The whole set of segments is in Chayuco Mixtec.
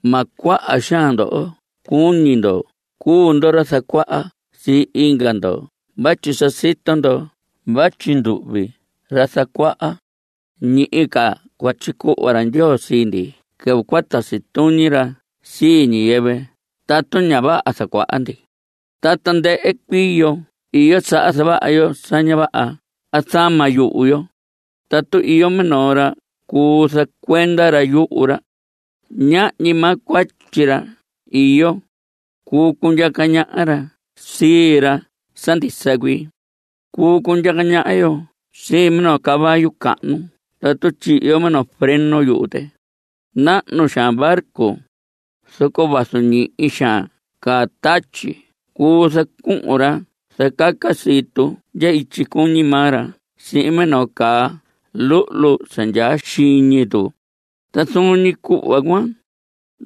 Ma cuaha xaan ndoho cuñi ndo cuu ndo ra zacuaha sii inga ndo vatyi sa sito ndo vatyi nduhvi ra zacuaha, ñihi ca cua tyicuhva ra Ndyoo sii ndi quɨvɨ cua tasi tuñi ra sii ñiyɨvɨ tatu ña vaha zacuaha ndi. Ta tandɨhɨ cuii yo iyo saha zavaha yo sa ña vaha a zama yuhu yo. Tatu iyo minoo ra cuu zacuenda ra yuhu ra, ñahñi maa cuatyi ra iyo. Cuu cundyaca ñaha ra sii ra sa ndisa cuii. Cuu cundyaca ñaha yo sii minoo caballo cahnu tatu tyihi yo minoo freno yuhu tɨ. Nahnu xaan barco, zoco vazu ñihi xaan caa tatyi cuu zacuhun ra zacaca sii tu ndya ityi cuñi maa ra sihin minoo caa luhlu sa ndyaa xiñi tu. Ta zuun ñi cuhva cuan,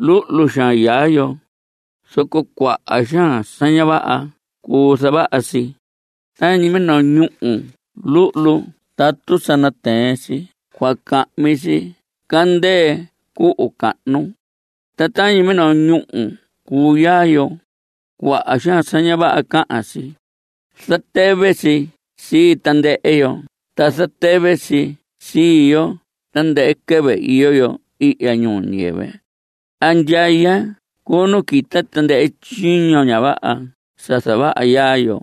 luhlu xaan yaa yo, zoco cuaha xaan sa ña vaha cuu zavaha si. Tañi minoo ñúhu luhlu tatu sa natɨɨn si cua cahmi si candɨɨ cuhu cahnu. Ta tañi minoo ñúhu cuu yaa yo. Cuaha xaan sa ña vaha cahan si. Zatɨvɨ si sii tandɨhɨ yo, ta zatɨvɨ si sii yo tandɨhɨ quɨvɨ iyo yo ihya ñuu ñiyɨvɨ. Andyaya cuu nu quita tandɨhɨ tyiño ña vaha sa zavaha yaa yo.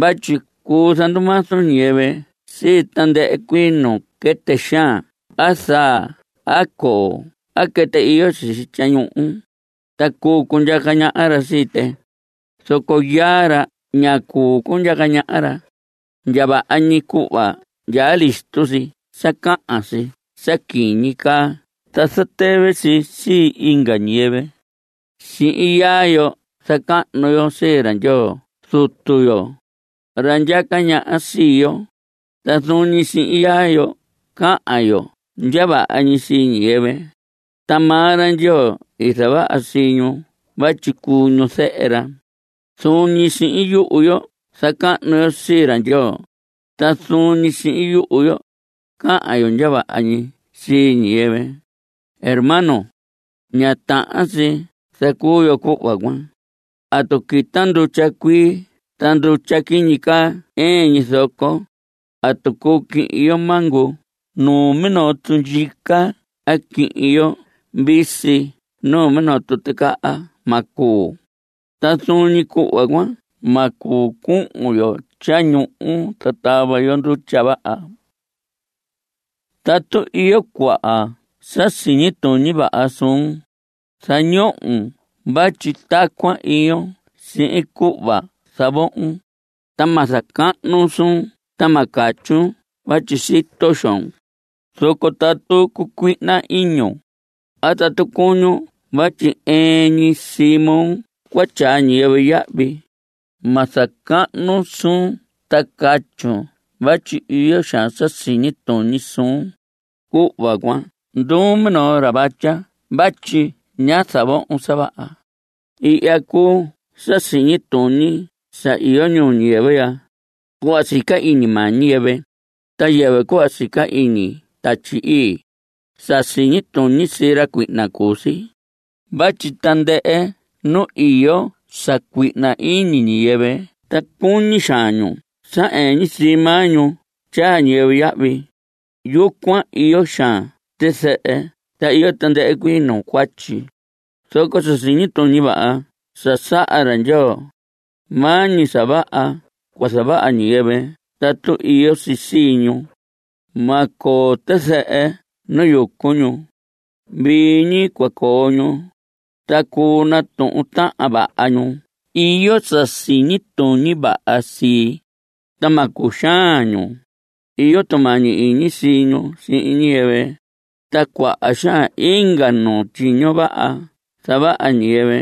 Vatyi cuu zandumazu ñiyɨvɨ sii tandɨhɨ cuii nuu quɨtɨ xaan a zaa a coo a quɨtɨ iyo sisi tyañuhu, ta cuu cundyaca ñaha ra sii tɨ. Zoco yaa ra ña cuu cundyaca ñaha ra. Ndya vaha ñi cuhva ndyaa listo si sa cahan si sa quiñi caa ta zatɨvɨ si sii inga ñiyɨvɨ. Sihin yaa yo zacahnu yo sii ra Ndyoo Zutu yo, ra ndyaca ñaha sii yo. Ta zuun ñi sihin yaa yo cahan yo ndya vaha ñi sii ñiyɨvɨ, ta maa ra Ndyoo i zavaha sii ñu vatyi cuu ñu zehe ra. Zuun ñi sihin yuhu yo zacahnu yo sii ra Ndyoo. Ta zuun ñi sihin yuhu yo cahan yo ndya vaha ñi sii ñiyɨvɨ. Hermanos, ña tahan si zacuu yo cuhva cuan. ¿Atu quita ndutya cuii ta ndutya quiñi caa ɨɨn ñi zoco? ¿Atu cuu quihin yo mango numinoo tundyica a quihin yo visi numinoo tuticaha? Ma cuu. Ta zuun ñi cuhva cuan ma cuu cuhun yo tyañuhu ta tava yo ndutya vaha. Tatu iyo cuaha sa siñi tuñi vaha suun, zañohon vatyi tacuan iyon sihin cuhva zavohon. Ta ma zacahnun suun ta ma catyun vatyi sito xoon. Zoco tatu cucuihna iñun, a tatu cuñun vatyi ɨɨn ñi sii moo cua tyaa ñiyɨvɨ yahvi, ma zacahnun suun ta catyun vatyi iyo xaan sa siñi tuñi suun. Cuhva cuan nduun minoo ra vatya vatyi ña zavohon sa vaha. Ihya cuu sa siñi tuñi sa iyo ñuu ñiyɨvɨ ya, cuhva sica iñi maa ñiyɨvɨ, ta yɨvɨ cuhva sica iñi Tatyi Ii. Sa siñi tuñi sii ra cuihna cuu si. Vatyi tandɨhɨ nu iyo sa cuihna iñi ñiyɨvɨ ta cuñi xaan ñu sa ɨɨn ñi sii maa ñu tyaa ñiyɨvɨ yahvi, yucuan iyo xaan tizɨhɨ ta iyo tandɨhɨ cuii nuu cuatyi. Zoco sa siñi tuñi vaha sa saha ra Ndyoo, maa ñi sa vaha cua zavaha ñiyɨvɨ tatu iyo si sii ñu. Ma coo tizɨhɨ nu yucu ñu. Vii ñi cua coo ñu. Ta cuu natuhun tahan vaha ñu iyo sa siñi tuñi vaha sii, ta ma cuxaan ñu. Iyo tumañi iñi sii ñu sihin ñiyɨvɨ. Ta cuaha xaan inga nuu tyiño vaha zavaha ñiyɨvɨ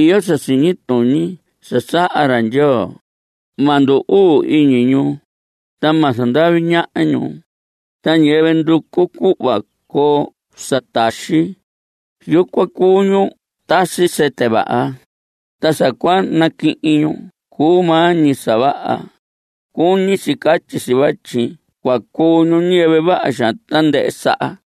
iyo sa siñi tuñi sa saha ra Ndyoo. Ma ndu‑uu iñi ñu, ta ma zandavi ñaha ñu. Ta ñiyɨvɨ nducu cuhva coo sa taxi, yucuan cuu ñu tasi sɨtɨ vaha. Ta sa cua naquihin ñu cuu maa ñi sa vaha. (Cuñi si catyi si vatyi cua cuu ñu ñiyɨvɨ vaha xaan tandɨhɨ saha.)